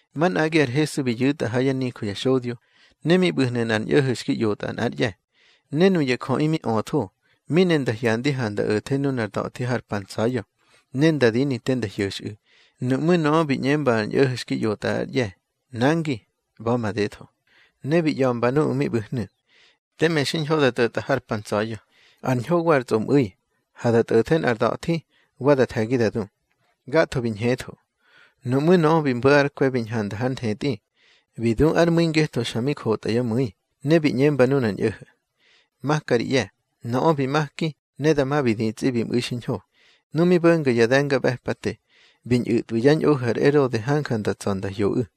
Manꞌagi ar Hesu bi yu̱tꞌa ha yá nijö ya xodyo, ne mi ꞌbu̱hnu̱ nꞌar ñꞌo̱ho̱ xki ꞌyotꞌa nꞌár ꞌye̱. Ne nuya jöꞌi mi öthó, mi ne nda hyandi ha nda o̱the nunar da̱thi har pa ntsa̱ya̱, ne nda dini te nda hyo̱xꞌu̱. Nuꞌmú̱ nöꞌö bi ꞌñemba ar ñꞌo̱ho̱ xki ꞌyotꞌa ár ꞌye̱: —Nangi, ꞌba̱ madetho. Ne bi ꞌya̱mba nuꞌu̱ mi ꞌbu̱hnu̱: —Teme xiñho da tꞌo̱tꞌa har pa ntsa̱ya̱, ar ñho wa ar tsꞌomꞌu̱i. Ha da tꞌo̱the nꞌar da̱thi, wa da the̱gi da du. Gatho bi ñhetho. Nuꞌmú̱ nöꞌö bi mbo̱ ár kwe̱ bi ñhanda hár nthetꞌi, bi du ár mu̱i ngetho xa mi kotyá mu̱i, ne bi ꞌñemba nunar ñꞌo̱ho̱: —Maka ri ꞌye̱. Nöꞌö bi maki, ne dama bi ditsꞌi bi mꞌu̱i xiñho. Nu mi bo̱nga ya de̱ngaꞌbe̱pate, bi ñꞌu̱tꞌwi yá ñꞌohu̱ ar Erode hanja nda tsa̱ nda hyoꞌu̱.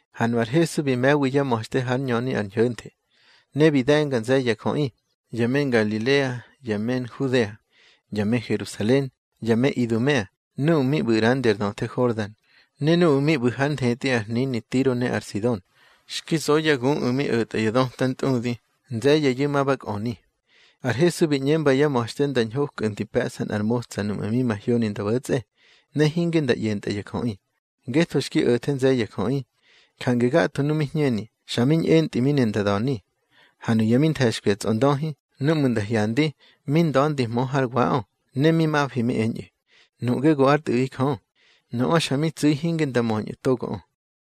Ha nu ar Hesu bi me̱wi yá ma̱xte hár ñöni ar ñho̱nthe. Ne bi de̱nga nze̱ye̱ ya jöꞌi, ya me Ngalilea, ya me Nhudea, ya me Herusalen, ya me Idumea, nuꞌu̱ mi ꞌbu̱ ꞌrandi ar döthe Hordan, ne nuꞌu̱ mi ꞌbu̱ hár nthetꞌi ar hnini Tiro ne ar Sidon. Xki zo yá guꞌu̱ mi o̱tꞌa ya döta ntꞌudi, nze̱ye̱yu̱ ma ba kꞌöni. Ar Hesu bi ꞌñemba yá ma̱xte nda ñhokꞌu̱ di pe̱ꞌsa nꞌar motsa núꞌmu̱ mi mahyoni nda bo̱tsꞌe, ne hinge nda ꞌyentꞌa ya jöꞌi. Ngetho xki o̱the nze̱ye̱ ya jöꞌi, jange gatho nuꞌu̱ mi hñeni, xa mi ñꞌentꞌi mi ne nda da̱ni. Ha nuya mi nthe̱xkwi ya tsꞌondöhi, núꞌmu̱ nda hyandi, mi nda̱ndihmö hár waꞌö, ne mi mafi mi eñꞌu̱: —Nuꞌge go ár Tꞌu̱ꞌi Jö. Nöꞌö xa mi tsu̱i hinge nda möñꞌu̱ togoꞌö.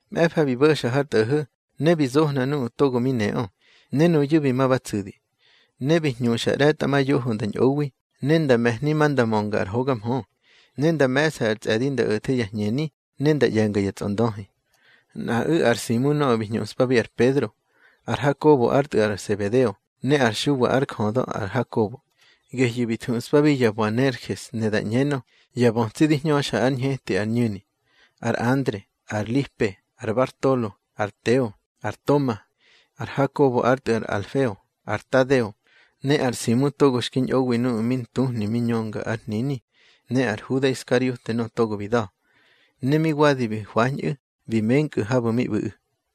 Mꞌe̱fa bi bo̱xa har tꞌo̱ho̱, ne bi zohna nuꞌu̱ togo mi neꞌö, ne nuyu̱ bi ma ba tsu̱di. Ne bi hñuxa ꞌre̱tꞌamayoho nda ñꞌowi, ne nda me̱hni ma nda mönga ar hoga mhö. Ne nda me̱ꞌsa ar tsꞌe̱di nda o̱the ya hñeni, ne nda ꞌye̱nga ya tsꞌondöhi. Nꞌaꞌu̱ ar Simu nöꞌö bi hñuꞌspabi ar Pedro, ar Hakobo ár tꞌu̱ ar Sebedeo, ne ar Xuwa ár jödö ar Hakobo, gehyu̱ bi thuꞌspabi ya Boanerges, ne da ꞌñenö: Ya bötsi di hñöxa ár hñeti ar ñu̱ni; ar Andre, ar Lipe, ar Bartolo, ar Teo, ar Toma, ar Hakobo ár tꞌu̱ ar Alfeo, ar Tadeo, ne ar Simu togo xki ñꞌowi nuꞌu̱ mi ntuhni mi ñönga ár hnini, ne ar Huda Iskariote nöꞌö togo bi da̱. Ne mi wadi bi hwañꞌu̱, bi menkꞌu̱ habu̱ mi ꞌbu̱ꞌu̱.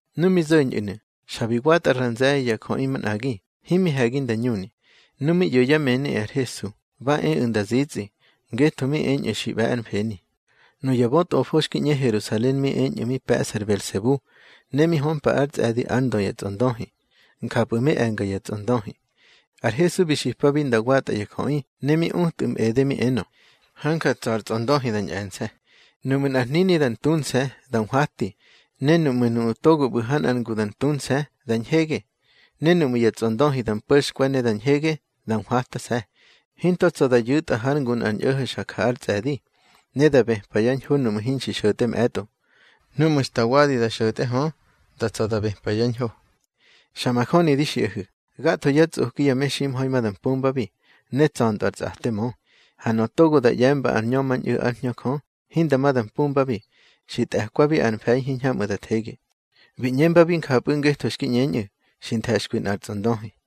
Nu mi zo̱ñꞌu̱nu̱, xa bi watꞌa ra nze̱ye̱ ya jöꞌi manꞌagi, himi he̱gi nda ñuni. Nu mi ꞌyo̱ yá mëni ar Hesu, ba eꞌu̱ nda zitsꞌi, ngetho mi eñꞌu̱ xi ꞌbe̱ ár mfeni. Nuya bötꞌofo xki ꞌñe Herusalen mi eñꞌu̱ mi pe̱ꞌsa ar Belsebu, ne mi hömpa ár tsꞌe̱di ár ndö ya tsꞌondöhi, njapꞌu̱ mi e̱nga ya tsꞌondöhi. Ar Hesu bi xipabi nda watꞌa ya jöꞌi, ne mi utꞌu̱ mꞌede, mi enö: —Hanja tsa̱ ar tsꞌondöhi da ñꞌe̱nse̱. Nuꞌmu̱ nꞌar hnini da ntunse̱, da nhwati. Ne nuꞌmu̱ nuꞌu̱ togo ꞌbu̱ ha nꞌar ngu da ntunse̱, da ñhege. Ne nuꞌmu̱ ya tsꞌondöhi da mpo̱xkwe̱ ne da ñhege, da nhwatase̱. Hinto tsa̱ da yu̱tꞌa hár ngu nꞌar ñꞌo̱ho̱ xa ja ár tsꞌe̱di, ne da bëpa yá ñho nuꞌmu̱ hinxi xo̱tꞌe mꞌe̱tꞌo. Núꞌmu̱ xta wadi da xo̱tꞌe hö, da tsa̱ da bëpa yá ñho. Xa majöni di xiꞌahu̱, gatho yá tsꞌoki ya meximha̱i ma da mpumbabi, ne tsa̱ntꞌö ar tsꞌate xi mö. Ha nöꞌö togo da ꞌye̱mba ar ñömañꞌu̱ ár Hñö Jö, hinda ma da mpumbabi. Xi tꞌe̱kwabi ar mfe̱i hiñhamꞌu̱ da thege. Bi ꞌñembabi njapꞌu̱ ngetho xki ꞌñeñꞌu̱: Xi nthe̱xkwi nꞌar tsꞌondöhi.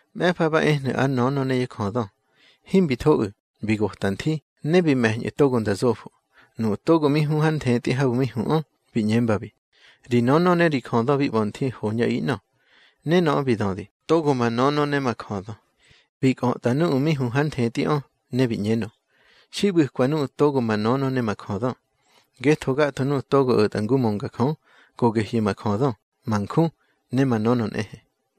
Mꞌe̱fa ba ehnu̱ ár nönö ne yá jödö, himbi thoꞌu̱, bi gota nthi, ne bi me̱ñꞌu̱ togo nda zofo. Nuꞌu̱ togo mi hu har nthetꞌi habu̱ mi huꞌö, bi ꞌñembabi: —Ri nönö ne ri jödö bi ꞌba̱ nthi, hoñꞌaꞌi ꞌnö. Ne nöꞌö bi dödi: —Togo ma nönö ne ma jödö. Bi kꞌötꞌa nuꞌu̱ mi hu hár nthetꞌiꞌö, ne bi ꞌñenö: —Xi ꞌbu̱kwa nuꞌu̱ togo ma nönö ne ma jödö. Ngetho gatho nuꞌu̱ togo o̱tꞌa ngu mönga Jö, go gehyu̱ ma jödö, ma nju ne ma nönö nꞌehe.